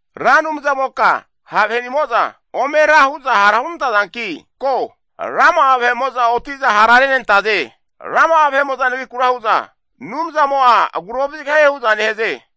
Ra Anumzamoka ha' vahenimo'za ome ra hu'za hara hunantazanki ko! Rama'a vahe'mo'za oti'za hara renantaze! Rama'a nagrikura hu'za, Anumzamo'a agura ovazigahie hu'za nehaze.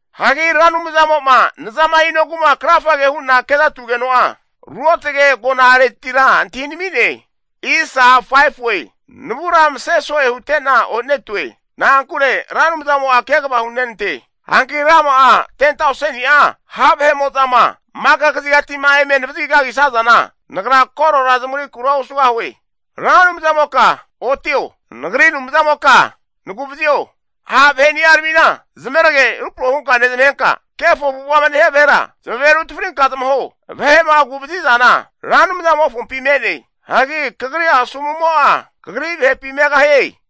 Hagi Ra Anumzamo'ma nzama hinogu'ma krafage hu'na ke'zatugeno'a, ruotge agona'aretira antahinami'ne. Navura mase so'e hute'na onetue, na'ankure Ra Anumzamo'a kegava hunenante. Hanki rama'a 10tauseni'a ha' vahe'mo'zama maka kazigati'ma eme navazagi kagisazana, nagra korora zamagrikura osugahue. Ra Anumzamoka, otio! Nagri Anumzamoka nagu'vazio! Ha' vahe'ni'aramina zamerage rupro hunka nezmahenka, kefo avu'ava'ma nehia vahera zamave rutafrinka zamaho. Vahe'ma agu'vazi zana Ra Anumzamofompi me'ne. Hagi kagri asomu'mo'a, kagri vahepi megahie.